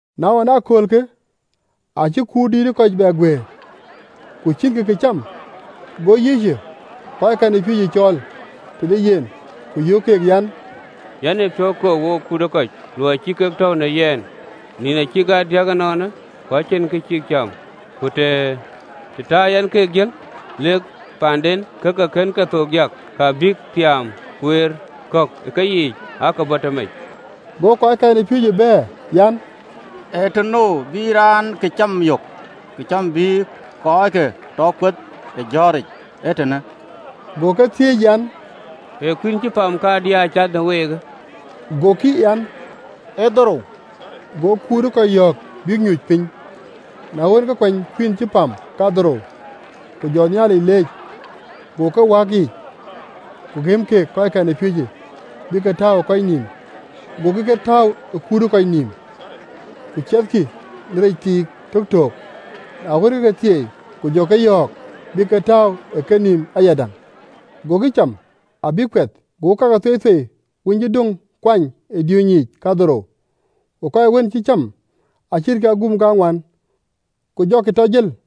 Na ɣɔn ë aköölkë, acï kut dïït ë kɔc bɛ guëër, ku cïnkï këcam, go Yecu kɔckɛn ë piööcë cɔɔl tëde yen, ku yöök keek an, “Yɛn ë piɔ̈u kok wo kut ë kɔc, luɔi cï kek tɔ̈u në yɛn, nïn acïk aa diäk ënɔɔnë ku acïnkï këcam: ku të ta yɛn keek jël lek paanden, ke ke kën kethook jak, ka bïk tiaam kueer, kɔ̈k ë keyiic aake bɔ̈ tëmec.” Go kɔckɛn ë piööcë bɛ̈ɛ̈r an, “Ee tënou bïï raan këcam yök, këcam bï kɔcke tɔ kueth ë jɔ̈ɔ̈ric eetënë?” Go ke thiëëc an, “Ee kuïn cï pam kadiaa cath në week?” Gokï bɛ̈ɛ̈r an, “Ee dhorou.” Go kut ë kɔc yɔ̈ɔ̈k bïk nyuc piny: na wën, ke kuany kuïïn cï pam kadhorou, ku jɔ Nhialic leec, go ke wääk yiic, ku gëm keek kɔckɛn ë piööcë, bïk ke tääu ë kɔc nïïm, gokï ke tääu ë kut ë kɔc nïïm. Ku ciɛthkï në rec thii töktöök: na wën, ke ke thieei, ku jɔ ke yɔ̈ɔ̈k an, bïk tääu ë kenïïm ayadäŋ. Gokï cam, abïk kuɛth: gokï kak athueithuei wën cï döŋ kuany ë diööny yiic kadhorou. Ku kɔc wën cï cam acïtkï aguum kaŋuan: ku jɔ ke tɔ jël.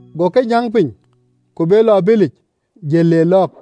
Go ke nyääŋ piny, ku be lɔ abëlic, jël le lɔɔk.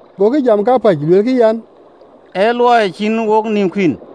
Gokï jam kapäc, luelkï an, “Ee luɔi cïn wok nïïm kuïn.”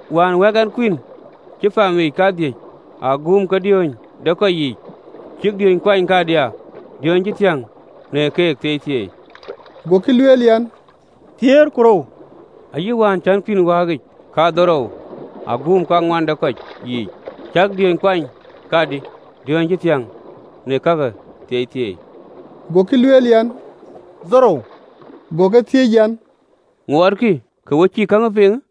Wään wääk ɛn kuïïn cï pam yiic kadhïc ë aguum kadhïny de kɔc yiic, cäk diööny kuany kadiaa, diööny cï thiäŋ në kak athueithuei?” Gokï lueel an, “Thiëër ku rou.” Ayï wään cän kuïïn wääk yiic kadhorou ë aguum kaŋuan de kɔc yiic, cäk diööny kuany kadï, diööny cï thiäŋ në kak athueithuei?” Gokï lueel an, “Dhorou.” Go ke thiëëc an, “Ŋuɔɔtkï ke we cïï käŋ ee piŋ?”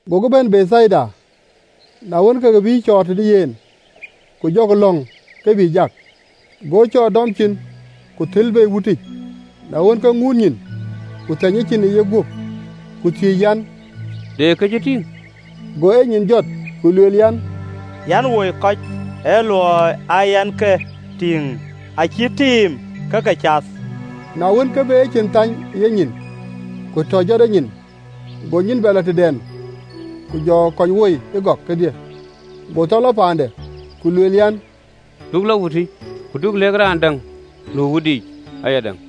Gokï bɛ̈n Bethaida. Na wën ke ke bïï cɔɔr tëde yen, ku jɔkï lɔ̈ŋ ke bï jak. Go cɔɔr dɔm ciin, ku thël bei wutic, na wën, ke ŋuut nyin, ku thɛny ecin ë yeguöp, ku thiëëc an, “De kë cï tïŋ?” Go enyin jɔt, ku lueel an, “Yɛn woi kɔc, ee luɔi aa yɛn ke tïŋ acït tiim, ke ke cath.” Na wën, ke be ecin thany ë yenyin, ku tɔ jɔt enyin. Go nyin bɛ lɔ tëden, ku jɔ kɔc woi ëgɔk kedhie. Go tɔ lɔ paande, ku lueel an, “Du lɔ wutic, ku du lëk raan däŋ nu wutic ayadäŋ.”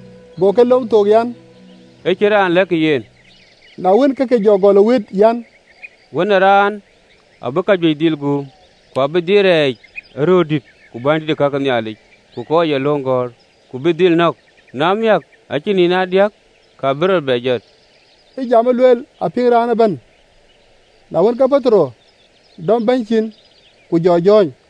Go ke lom thook an, “Ë cïn raan lɛ̈kkï yen.” Na wën, ke ke jɔ gɔl ë wëët an, “Wën ë Raan abï kajuëc dhil guum, ku bï dhil rɛɛc ë röördït, ku bänydït ke ka ke Nhialic, ku kɔc ee löŋ gɔ̈ɔ̈r, ku bï dhil nɔ̈k, na miäk, acï nïn aa diäk, ka bï rɔt bɛ jɔt.” Ë jamë lueel a piŋ raan ëbɛ̈n. Na wën, ke Petero dɔm Bɛ̈ny cin, ku jɔ jɔ̈ɔ̈ny.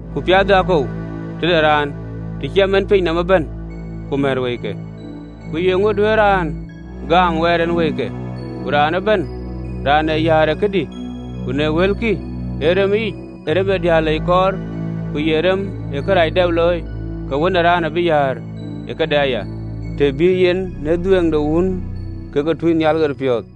Ku piathde akɔ̈u tëde raan, të ciɛm en piny nɔm ëbɛ̈n, ku mɛ̈ɛ̈r wëike? Ku ye ŋö duëër raan gaam wɛɛr en wëike? Ku raan ëbɛ̈n raan ë yäär ë këdï ku në wëlkï ë remë yic rem ë diëër lei kɔɔr, ku ye rem ë kërac dap looi, ke Wën ë Raan abï yäär ë këde aya, Të nu yen në dhuëëŋ de Wun kekë tuucnhial ɣeriic.”